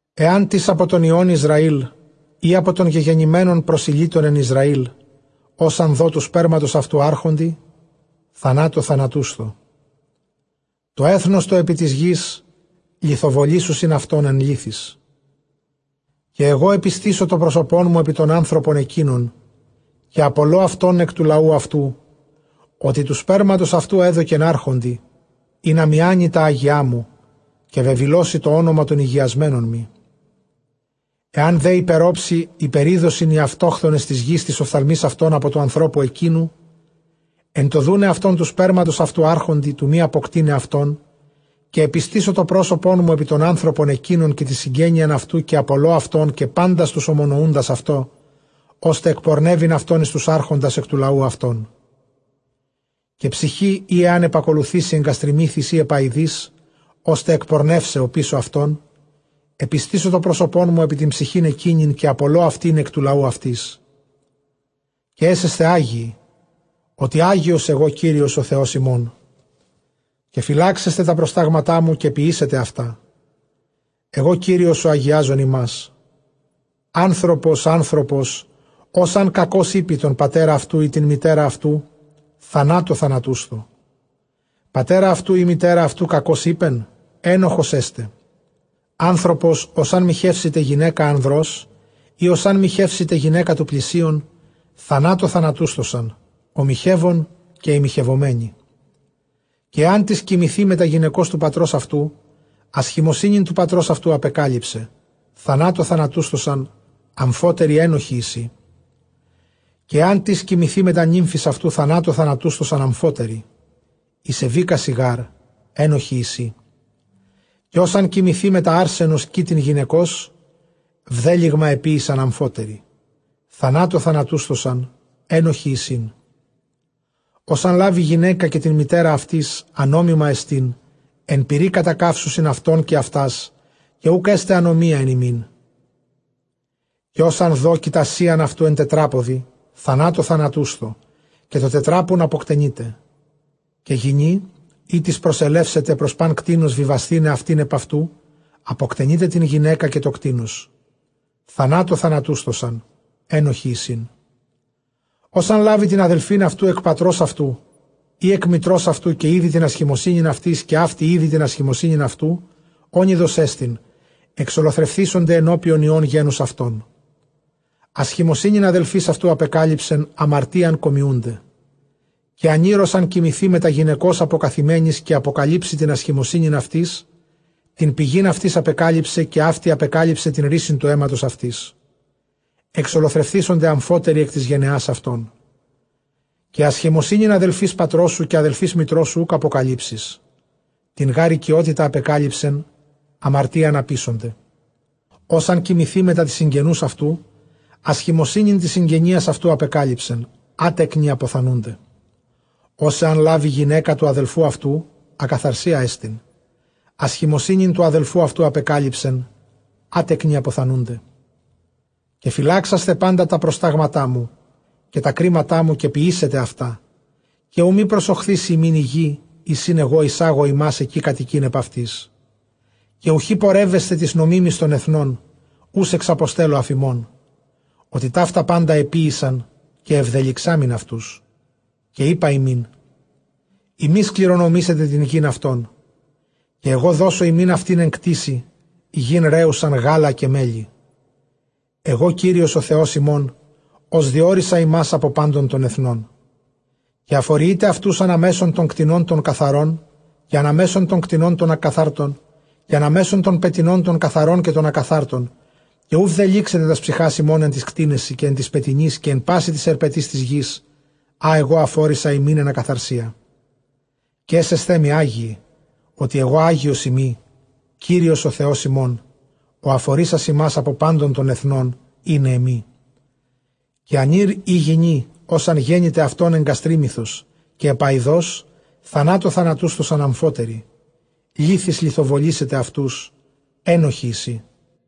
ἐάν τις ἀπὸ τῶν υἱῶν Ἰσραὴλ, ἢ ἀπὸ τῶν γεγενημένων προσηλύτων ἐν Ἰσραὴλ, ὃς ἂν δῷ τοῦ σπέρματος αὐτοῦ ἄρχοντι, θανάτῳ θανατούσθω· τὸ ἔθνος τὸ ἐπὶ τῆς γῆς λιθοβολήσουσιν αὐτὸν ἐν λίθοις. Καὶ ἐγὼ ἐπιστήσω τὸ πρόσωπόν μου ἐπὶ τὸν ἄνθρωπον ἐκεῖνον, καὶ ἀπολῶ αὐτὸν ἐκ τοῦ λαοῦ αὐτοῦ, ὅτι τοῦ σπέρματος αὐτοῦ ἔδωκεν ἄρχοντι, ἵνα μιάνῃ τὰ ἅγιά μου, καὶ βεβηλώσῃ τὸ ὄνομα τῶν ἡγιασμένων μοι. Ἐὰν δὲ ὑπερόψει ὑπερίδωσιν οἱ αὐτόχθονες τῆς γῆς τοῖς ὀφθαλμοῖς αὐτῶν ἀπὸ τοῦ ἀνθρώπου ἐκείνου, ἐν τῷ δοῦναι αὐτὸν τοῦ σπέρματος αὐτοῦ ἄρχοντι, τοῦ μὴ ἀποκτεῖναι αὐτόν· καὶ ἐπιστήσω τὸ πρόσωπόν μου ἐπὶ τὸν ἄνθρωπον ἐκεῖνον, καὶ τὴν συγγένειαν αὐτοῦ, καὶ ἀπολῶ αὐτὸν, καὶ πάντας τοὺς ὁμονοοῦντας αὐτῷ, ὥστε ἐκπορνεύειν αὐτὸν εἰς τοὺς ἄρχοντας, ἐκ τοῦ λαοῦ αὐτῶν. Καὶ ψυχὴ ἣ ἂν ἐπακολουθήσῃ ἐγγαστριμύθοις ἢ ἐπαοιδοῖς, ὥστε ἐκπορνεῦσαι ὀπίσω αὐτῶν, ἐπιστήσω τὸ πρόσωπόν μου ἐπὶ τὴν ψυχὴν ἐκείνην, καὶ ἀπολῶ αὐτῆν ἐκ τοῦ λαοῦ αὐτῆς. Καὶ ἔσεσθε ἅγιοι, ὅτι ἅγιος ἐγὼ Κύριος ὁ Θεὸς ὑμῶν. Καὶ φυλάξεσθε τὰ προστάγματά μου, καὶ ποιήσετε αὐτά· ἐγὼ Κύριος ὁ ἁγιάζεν ὑμᾶς. Ἄνθρωπος ἄνθρωπος, ὃς ἂν κακῶς εἴπῃ τὸν πατέρα αὐτοῦ ἢ τὴν μητέρα αὐτοῦ, θανάτῳ θανατούσθω· πατέρα αὐτοῦ ἢ μητέρα αὐτοῦ κακῶς εἶπεν; ἔνοχος ἔσται. Ἄνθρωπος ὃς ἂν μοιχεύσηται γυναῖκα ἀνδρός, ἢ ὃς ἂν μοιχεύσηται γυναῖκα τοῦ πλησίον, θανάτῳ θανατούσθωσαν, ὁ μοιχεύων καὶ ἡ μοιχευομένη. Καὶ ἐάν τις κοιμηθῇ μετὰ γυναικὸς τοῦ πατρὸς αὐτοῦ, ἀσχημοσύνην τοῦ πατρὸς αὐτοῦ ἀπεκάλυσε· θανάτῳ θανατούσθωσαν ἀμφότεροι, ἔνοχοί εἰσι. Καὶ ἐάν τις κοιμηθῇ μετὰ νύμφης αὐτοῦ, θανάτῳ θανατούσθωσαν ἀμφότεροι· ἠσεβήκασι γάρ, ἔνοχοί εἰσι. Καὶ ὃς ἂν κοιμηθῇ μετὰ ἄρσενος κοίτην γυναικὸς, βδέλυγμα ἐποίησαν ἀμφότεροι· θανάτῳ θανατούσθωσαν, ἔνοχοι εἰσιν. Ὃς ἂν λάβῃ γυναῖκα καὶ τὴν μητέρα αὐτῆς, ἀνόμημά ἐστιν· ἐν πυρὶ κατακαύσουσιν αὐτὸν καὶ αὐτὰς, καὶ οὐκ ἔσται ἀνομία ἐν ὑμῖν. Καὶ ὃς ἂν δῷ κοιτασίαν αὐτοῦ ἐν τετράποδι, θανάτῳ θανάτούσθω, καὶ τὸ τετράπουν ἀποκτενεῖτε. Καὶ γυνὴ ἥτις προσελεύσεται πρὸς πᾶν κτῆνος βιβασθῆναι αὐτὴν ὑπʼ αὐτοὺ, ἀποκτενεῖτε τὴν γυναῖκα καὶ τὸ κτῆνος· θανάτῳ θανατούσθωσαν, ἔνοχοί εἰσιν. Ὃς ἂν λάβῃ τὴν ἀδελφὴν αὐτοῦ ἐκ πατρὸς αὐτοῦ ἢ ἐκ μητρὸς αὐτοῦ, καὶ ἴδῃ τὴν ἀσχημοσύνην αὐτῆς, καὶ αὕτη ἴδῃ τὴν ἀσχημοσύνην αὐτοῦ, ὄνειδός ἐστιν, ἐξολοθρευθήσονται ἐνωπιον υἱῶν γένους αὐτῶν· ἀσχημοσύνην ἀδελφῆς αὐτοῦ ἀπεκάλυψεν, ἁμαρτίαν κομιοῦνται. Καὶ ἀνὴρ ὃς ἂν κοιμηθῇ μετὰ γυναικὸς ἀποκαθημένης, καὶ ἀποκαλύψῃ τὴν ἀσχημοσύνην αὐτῆς, τὴν πηγὴν αὐτῆς ἀπεκάλυψε, καὶ αὕτη ἀπεκάλυψε τὴν ῥύσιν τοῦ αἵματος αὐτῆς· ἐξολοθρευθήσονται ἀμφότεροι ἐκ τῆς γενεᾶς αὐτῶν. Καὶ ἀσχημοσύνην ἀδελφῆς πατρὸς σου, καὶ ἀδελφῆς μητρός σου οὐκ ἀποκαλύψεις· τὴν γὰρ οἰκειότητα ἀπεκάλυψεν, ἁμαρτίαν ἀποίσονται. Ὃς ἂν κοιμηθῇ μετὰ τῆς συγγενοῦς αὐτοῦ, ἀσχημοσύνην τῆς συγγενείας αὐτοῦ ἀπεκάλυψεν, ἄτεκνοι ἀποθανοῦνται. Ὃς ἐὰς λάβῃ γυναῖκα τοῦ ἀδελφοῦ αὐτοῦ, ἀκαθαρσία ἐστίν· ἀσχημοσύνην τοῦ ἀδελφοῦ αὐτοῦ ἀπεκάλυψεν, ἄτεκνοι ἀποθανοῦνται. Καὶ φυλάξασθε πάντα τὰ προστάγματά μου, καὶ τὰ κρίματά μου, καὶ ποιήσετε αὐτὰ, καὶ οὐ μὴ προσοχθίσῃ ὑμῖν ἡ γῆ, εἰς ἣν ἐγὼ εἰσάγω ὑμᾶς ἐκεῖ κατοικεῖν ἐπʼ αὐτῆς. Καὶ οὐχὶ πορεύεσθε τοῖς νομίμοις τῶν ἐθνῶν, οὓς ἐξαποστέλλω ἀφʼ ὑμῶν· ὅτι ταῦτα πάντα ἐποίησαν, καὶ ἐβδελυξάμην αὐτούς. Καὶ εἶπα ὑμῖν, ὑμεῖς κληρονομήσετε τὴν γῆν αὐτῶν, καὶ ἐγὼ δώσω ὑμῖν αὐτὴν ἐν κτήσει, γῆν ῥέουσαν γάλα καὶ μέλι· ἐγὼ Κύριος ὁ Θεὸς ὑμῶν, ὃς διώρισα ὑμᾶς ἀπὸ πάντων τῶν ἐθνῶν. Καὶ ἀφοριεῖτε αὐτοὺς ἀναμέσον τῶν κτηνῶν τῶν καθαρῶν καὶ ἀναμέσον τῶν κτηνῶν τῶν ἀκαθάρτων, καὶ ἀναμέσον τῶν πετεινῶν τῶν καθαρῶν καὶ τῶν ἀκαθάρτων· καὶ οὐ βδελύξετε τὰς ψυχὰς ὑμῶν ἐν τοῖς κτήνεσι, καὶ ἐν τοῖς πετεινοῖς, καὶ ἐν πᾶσι τοῖς ἑρπετοῖς τῆς γῆς ἃ ἐγὼ ἀφώρισα ὑμῖν ἐν ἀκαθαρσίᾳ. Καὶ ἔσεσθέ μοι ἅγιοι, ὅτι ἐγὼ ἅγιός εἶμι Κύριος ὁ Θεὸς ὑμῶν, ὁ ἀφορίσας ὑμᾶς ἀπὸ πάντων τῶν ἐθνῶν, εἶναί μοι. Καὶ ἀνὴρ ἢ γυνὴ ὃς ἂν γένηται αὐτῶν ἐγγαστρίμυθος ἢ ἐπαοιδός, θανάτῳ θανατούσθωσαν ἀμφότεροι· λίθοις λιθοβολήσετε αὐτοὺς, ἔνοχοί εἰσι.